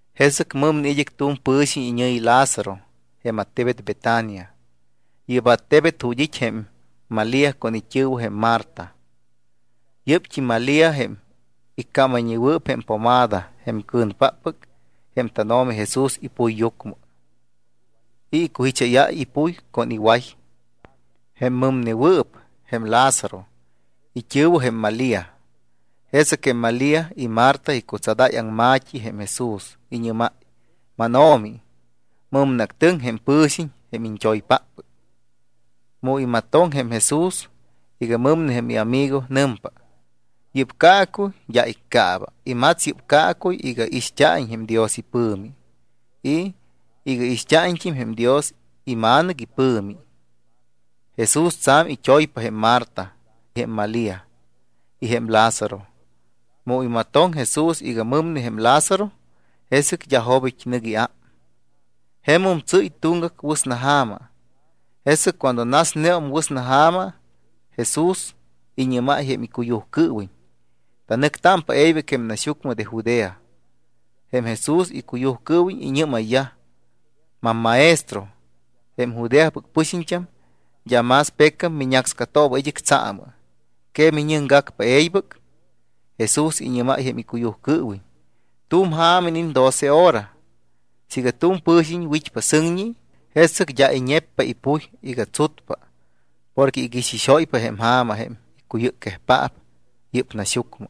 Jesɨc mɨmne tu̱m pɨ̱xiñ iñɨ̱yi Lázaro jém attebet Betania. Yɨ́p jém attebet ju̱t́ it́ jém Malía con it́ɨ̱wɨ jém Marta. Yɨ́pt́im Malía jém iccámayñewɨɨp jém pomada jém cɨ̱npaap jém tánO̱mi Jesús ipuyyucmɨ y icujicháyáy ipuy con iway. Jém mɨmnewɨɨp, jém Lázaro, it́ɨ̱wɨt́im jém Malía. Jesɨc jém Malía y Marta icutsadáy aŋma̱t́i jém Jesús. Iñɨ́máy: —MánO̱mi, mɨmneactɨŋ jém pɨ̱xiñ, jém iñt́oypáppɨc. Mu imatoŋ jém Jesús iga mɨmne jém iamigo, nɨmpa: —Yɨ́p caacuy d́a iccaaba. Imats yɨ́p caacuy iga ixt́a̱iñ jém Dios ipɨ̱mi y iga ixt́a̱iñt́im jém Dios iMa̱nɨc ipɨ̱mi. Jesús tsa̱m it́oypa jém Marta, jém Malía y jém Lázaro. Mu imatoŋ Jesús iga mɨmne jém Lázaro, jesɨc d́a jobit́ nɨc iám, jemum tsɨ́y tuŋgac wɨsnaja̱ma. Jesɨc cuando nasneum wɨsnaja̱ma, Jesús iñɨ́máy jém icuyujcɨɨwiñ: —Tanɨctámpa e̱ybɨc jém naxyucmɨ de Judea. Jém Jesús icuyujcɨɨwiñ iñɨ́mayyaj: —MamMaestro, jém Judeapɨc pɨxiñt́am d́a más pecam miñácscatooba id́ɨc tsaamɨ. ¿Que miñɨcgacpa e̱ybɨc? Jesús iñɨ́máy jém icuyujcɨɨwiñ: —Tu̱m ja̱ma iniit́ doce hora. Siiga tu̱m pɨ̱xiñ wit́pa sɨŋñi, jesɨc d́a iñeppa ipuy iga tsutpa porque iguixixóypa jém ja̱ma jém icuyɨcquejpaap yɨ́p naxyucmɨ.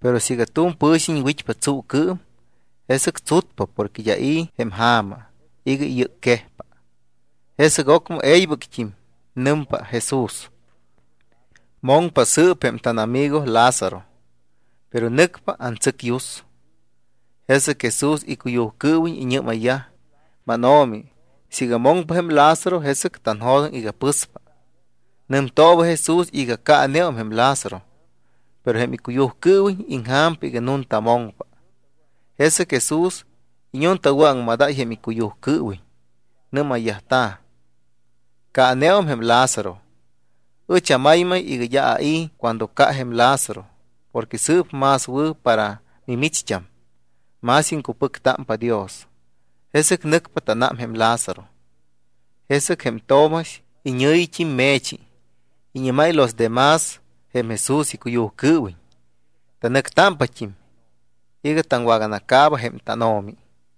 Pero siiga tu̱m pɨ̱xiñ wit́pa tsuucɨɨm, jesɨc tsutpa porque d́a i̱ jém ja̱ma iga iyɨcquejpa. Jesɨc ocmɨ e̱ybɨct́im nɨmpa Jesús: —Moŋpa sɨɨp jém tánamigo Lázaro, pero nɨcpa antsɨcyus. Jesɨc Jesús icuyujcɨɨwiñ iñɨ́mayyaj: —MánO̱mi, siiga moŋpa jém Lázaro, jesɨc tanjo̱doŋ iga pɨspa. Nɨmtooba Jesús iga caaneum jém Lázaro, pero jém icuyujcɨɨwiñ iŋja̱mpa iga nunta moŋpa. Jesɨc Jesús iñuumaŋmadáy jém icuyujcɨɨwiñ. Nɨ́mayyajta̱: —Caaneum jém Lázaro. Ɨch amaymay iga d́a ai̱ cuando ca jém Lázaro porque sɨɨp más wɨ̱ para mimicht́am. Más iŋcupɨctámpa Dios. Jesɨc nɨcpa tánám jém Lázaro. Jesɨc jém Tomax, iñɨ̱yit́im Me̱chi, iñɨ́máy los de más jém Jesús icuyujcɨɨwiñ: —Tanɨctámpat́im iga taŋwaganacaaba jém tánO̱mi.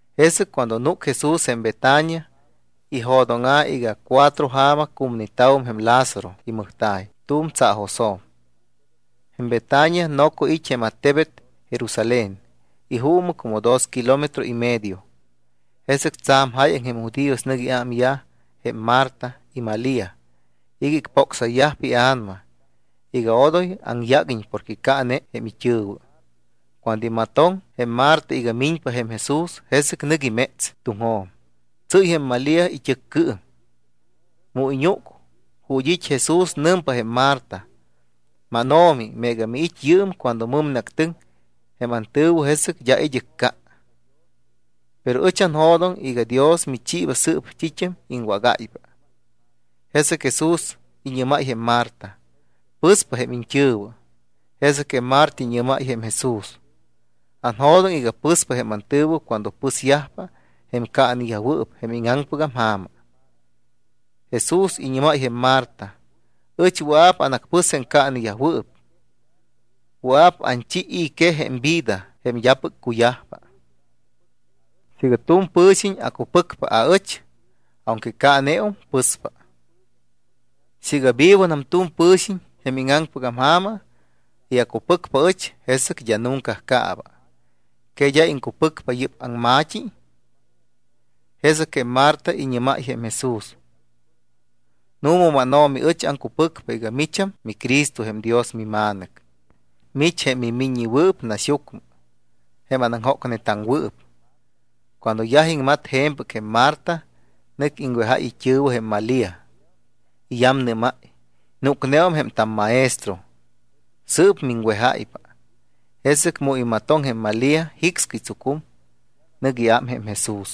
Jesɨc cuando núc Jesús jém Betania, ijo̱dóŋa̱ iga cuatro ja̱ma cumneta̱wum jém Lázaro imɨjta̱y tu̱m tsaajosjo̱m. Jém Betania noco it́ jém attebet Jerusalén, ijuumɨ como dos kilómetro y medio. Jesɨc tsa̱m jáyaŋ jém judíos nɨc iámyaj jém Marta y Malía iga icpócsayyajpa ia̱nama iga odoy aŋyáguiñ porque caane jém it́ɨ̱wɨ. Cuando imatoŋ jém Marta iga miñpa jém Jesús, jesɨc nɨc iméts tuŋjo̱m. Tsɨ́y jém Malía it́ɨccɨɨm. Mu iñúc ju̱t́ it́ Jesús, nɨmpa jém Marta: —MánO̱mi, meega miit́ yɨɨm cuando mɨmneactɨŋ jém antɨ̱wɨ, jesɨc d́a id́ɨc ca. Pero ɨch anjo̱doŋ iga Dios michiiba sɨɨp t́it́am iŋwágáypa. Jesɨc Jesús iñɨ́máy jém Marta: —Pɨspa jém iñt́ɨ̱wɨ. Jesɨc Marta iñɨ́máy jém Jesús: —Anjo̱doŋ iga pɨspa jém antɨ̱wɨ cuando pɨsyajpa jém caaneyajwɨɨp jém íŋaŋpɨgam ja̱ma. Jesús iñɨ́máy jém Marta: —Ɨch wɨa̱p anacpɨs jém caaneyajwɨɨp. Wɨa̱p anchi i̱ quej jém vida jém d́apɨc cuyajpa. Siiga tu̱m pɨ̱xiñ acupɨcpa aɨch, aunque caaneum, pɨspa. Siiga vivonam tu̱m pɨ̱xiñ jém íŋaŋpɨgam ja̱ma y acupɨcpa aɨch, jesɨc d́a nunca caaba. ¿Que d́a iŋcupɨcpa yɨ́p aŋma̱t́i? Jesɨc jém Marta iñɨ́máy jém Jesús: —Nu̱ma, mánO̱mi, ɨch aŋcupɨcpa iga micham miCristo jém Dios miMa̱nɨc. Mich jém mimiññewɨɨp naxyucmɨ, jém anaŋjócnetaŋwɨɨp. Cuando yaj iŋmat je̱mpɨc jém Marta, nɨc iŋwejáy it́ɨ̱wɨ jém Malía. Iyamnɨ́máy: —Núcneum jém tamMaestro, sɨɨp miŋwejáypa. Jesɨc mu imatoŋ jém Malía, jicscɨy tsucum, nɨc iám jém Jesús.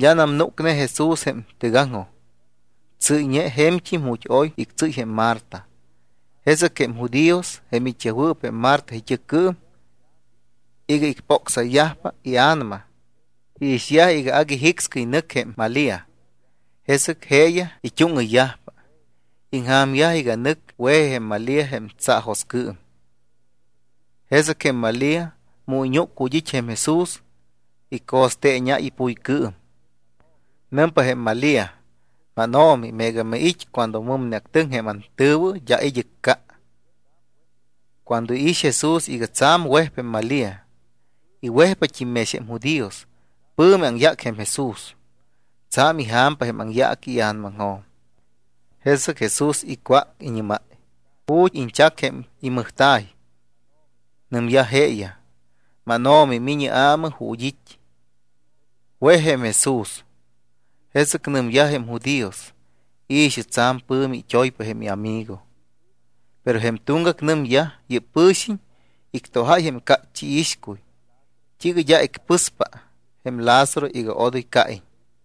D́anam núcne Jesús jém tɨgaŋjoj. Tsɨ́yñe je̱mt́im ju̱t́ oy ictsɨ́y jém Marta. Jesɨc jém judíos, jém it́yajwɨɨp jém Marta it́ɨccɨɨm iga icpócsayyajpa ia̱nama, iixyaj iga agui jicscɨy nɨc jém Malía. Jesɨc jeeyaj it́úŋɨyyajpa. Iŋja̱myaj iga nɨc we̱ji jém Malía jém tsaajoscɨɨm. Jesɨc jém Malía, mu iñúc ju̱t́ it́ jém Jesús, ico̱steeñáy ipuycɨɨm. Nɨmpa jém Malía: —MánO̱mi, meega miit́ cuando mɨmneactɨŋ jém antɨ̱wɨ, d́a id́ɨc ca. Cuando iix Jesús iga tsa̱m wejpa jém Malía y wejyajpat́im mex jém judíos, pɨ̱mi aŋyác jém Jesús, tsa̱m ija̱mpa jém aŋyaaqui ia̱namaŋjo̱m. Jesɨc Jesús icwác, iñɨ́máy: —¿Ju̱t́ iñchac jém imɨjta̱y? Nɨmyaj jeeyaj: —MánO̱mi, mi̱ñɨ aamɨ ju̱t́ it́. Wej jém Jesús. Jesɨc nɨmyaj jém judíos: —I̱xɨ. Tsa̱m pɨ̱mi it́oypa jém iamigo. Pero jém tuŋgac nɨmyaj: —Yɨ́p pɨ̱xiñ ictojáy jém cácht́i iixcuy, ¿t́iiga d́a icpɨspa jém Lázaro iga odoy caiñ?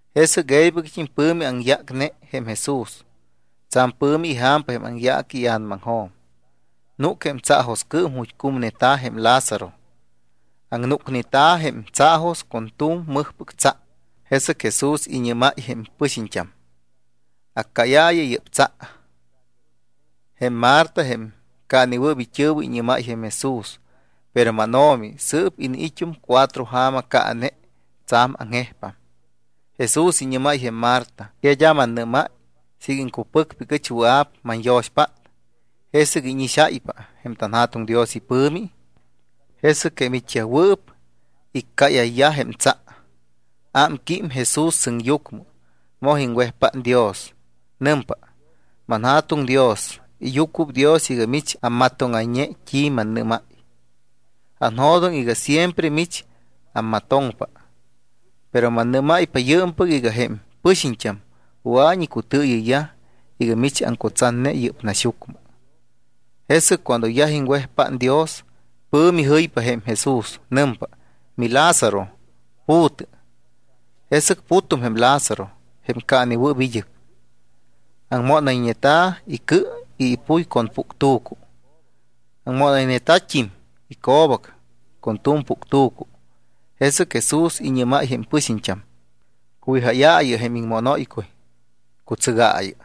Jesɨc e̱ybɨct́im pɨ̱mi aŋyácne jém Jesús, tsa̱m pɨ̱mi ija̱mpa jém aŋyaaqui ia̱namaŋjo̱m. Núc jém tsaajoscɨɨm ju̱t́ cumneta̱ jém Lázaro. Aŋnúcneta̱ jém tsaajos con tu̱m mɨjpɨc tsa. Jesɨc Jesús iñɨ́máy jém pɨxiñt́am: —Accáyaayɨ yɨ́p tsa. Jém Marta, jém caanewɨɨp it́ɨ̱wɨ, iñɨ́máy jém Jesús: —Pero mánO̱mi, sɨɨp iniit́um cuatro ja̱ma caane, tsa̱m aŋjejpam. Jesús iñɨ́máy jém Marta: —¿Que d́a mannɨ́máy siiga iŋcupɨcpa iga ɨch wɨa̱p manyo̱xpát, jesɨc íñixáypa jém tanJa̱tuŋ Dios ipɨ̱mi? Jesɨc jém it́yajwɨɨp iccáyayyaj jém tsa. Ámquím Jesús sɨŋyucmɨ, moj iŋwejpát Dios. Nɨmpa: —ManJa̱tuŋ Dios, iyucuɨpdios iga mich ammatóŋayñe t́i mannɨ́máy. Anjo̱doŋ iga siempre mich ammatoŋpa, pero mannɨ́máypa yɨɨmpɨc iga jém pɨxiñt́am wɨa̱iñ icutɨɨyɨyyaj iga mich aŋcutsatne yɨ́p naxyucmɨ. Jesɨc cuando yaj iŋwejpát Dios, pɨ̱mi jɨypa jém Jesús. Nɨmpa: —MiLázaro, pu̱tɨ. Jesɨc putum jém Lázaro, jém caanewɨ́ppɨc id́ɨc. Aŋmónayñeta̱ icɨ y ipuy con puctu̱cu. Aŋmónayñeta̱t́im ico̱bac con tu̱m puctu̱cu. Jesɨc Jesús iñɨ́máy jém pɨxiñt́am: —¡Cuwijáyaayɨ jém iŋmónóycuy, cutsɨgaayɨ!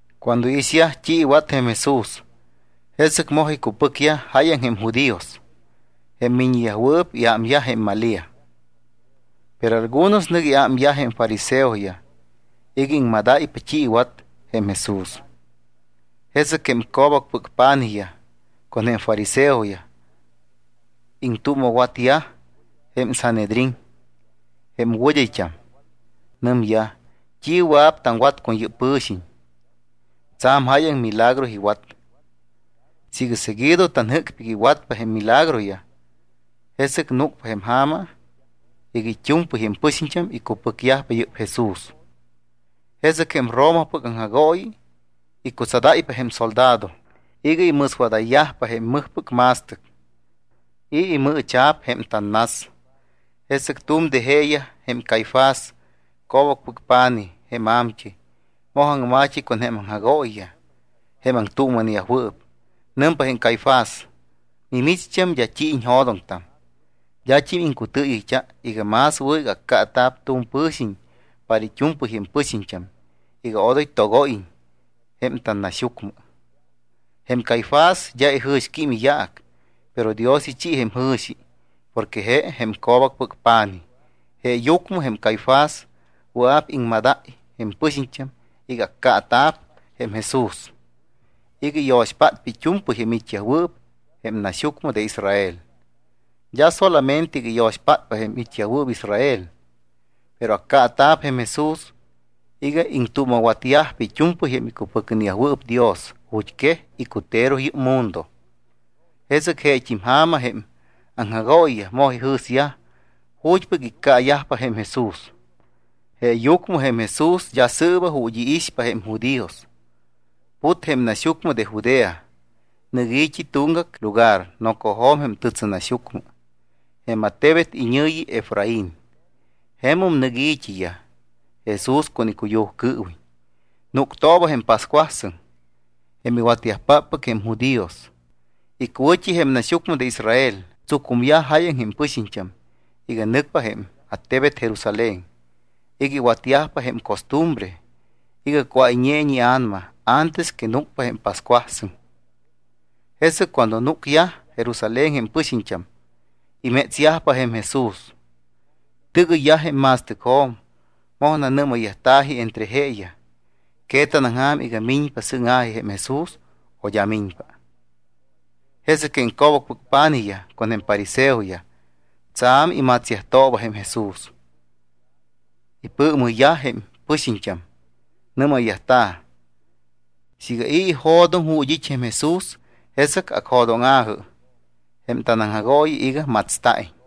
Cuando iixyaj t́i iwat jém Jesús, jesɨc moj icupɨcyaj jáyaŋ jém judíos jém miññeyajwɨɨp iám jém Malía. Pero algunos nɨc iámyaj jém fariseoyaj iga iŋmadáypa t́i iwat jém Jesús. Jesɨc jém co̱bacpɨc pa̱nijyaj, con jém fariseoyaj, iŋtuuma̱watyaj jém Sanhedrín, jém wɨd́ayt́am. Nɨmyaj: —¿T́i wɨa̱p taŋwatta con yɨ́p pɨ̱xiñ? Tsa̱m jáyaŋ milagro iwat. Siiga seguido tanjɨ́cpa iga iwatpa jém milagroyaj, jesɨc núcpa jém ja̱ma iga it́u̱mpɨy jém pɨxiñt́am icupɨcyajpa yɨ́p Jesús. Jesɨc jém Romapɨc aŋjagooyi icutsadáypa jém soldado iga imɨswadayyajpa jém mɨjpɨc ma̱stɨc y imɨɨcha̱p jém tannas. Jesɨc tu̱m de jeeyaj, jém Caifás, co̱bacpɨc pa̱nij jém a̱mt́ɨy, moj aŋma̱t́i con jém aŋjagooyiyaj jém aŋtuuma̱neyajwɨɨp. Nɨmpa jém Caifás: —Mimicht́am d́a t́i iñjo̱doŋtam. D́at́im iŋcutɨɨyɨyt́a iga más wɨ̱ iga accaata̱p tu̱m pɨ̱xiñ para it́u̱mpɨy jém pɨxiñt́am iga odoy togóyiñ jém tannaxyucmɨ. Jém Caifás d́a ijɨ̱xquím iyaac, pero Dios ichi jém jɨ̱xi porque je jém co̱bacpɨc pa̱nij. Jeeyucmɨ jém Caifás wɨa̱p iŋmadáy jém pɨxiñt́am iga accaata̱p jém Jesús iga iyo̱xpátpa it́u̱mpɨy jém it́yajwɨɨp jém naxyucmɨ Israel. D́a solamente iga iyo̱xpátpa jém it́yajwɨɨp Israel, pero accaata̱p jém Jesús iga iŋtuuma̱watyajpa it́u̱mpɨy jém icupɨcneyajwɨɨp Dios ju̱t́quej icutero yɨ́p mundo. Jesɨc jeet́im ja̱ma jém aŋjagooyiyaj moj ijɨ̱syaj ju̱t́pɨc iccaayajpa jém Jesús. Jeeyucmɨ jém Jesús d́a sɨɨba ju̱t́ iixpa jém judíos. Put jém naxyucmɨ de Judea. Nɨc i̱t́i tuŋgac lugar nocojo̱m jém tɨtsɨnaxyucmɨ. Jém attebet iñɨ̱yi Efraín. Jemum nɨc i̱t́iyaj Jesús con icuyujcɨɨwiñ. Núctooba jém pascuasɨŋ jém iwatyajpáppɨc jém judíos. Icuwɨ̱t́i jém naxyucmɨ de Israel tsucumyaj jáyaŋ jém pɨxiñt́am iga nɨcyajpa jém attebet Jerusalén iga iwatyajpa jém costumbre iga cuáyñeiñ ia̱nama antes que núcpa jém pascuasɨŋ. Jesɨc cuando núcyaj Jerusalén jém pɨxiñt́am, imétsyajpa jém Jesús. Tɨgɨyyaj jém ma̱stɨcjo̱m, moj nanɨ́mayyajta̱ji entre jeeyaj: —¿Que tanaŋja̱m iga miñpa sɨŋa̱ji jém Jesús o d́a miñpa? Jesɨc jém co̱bacpɨc pa̱nijyaj con jém fariseoyaj tsa̱m imatsyajtooba jém Jesús. Ipɨɨmɨyyaj jém pɨxiñt́am, nɨ́mayyajta̱: —Siiga i̱ ijo̱doŋ ju̱t́ it́ jém Jesús, jesɨc acjo̱dóŋa̱jɨ jém tanaŋjagooyi iga matsta̱iñ.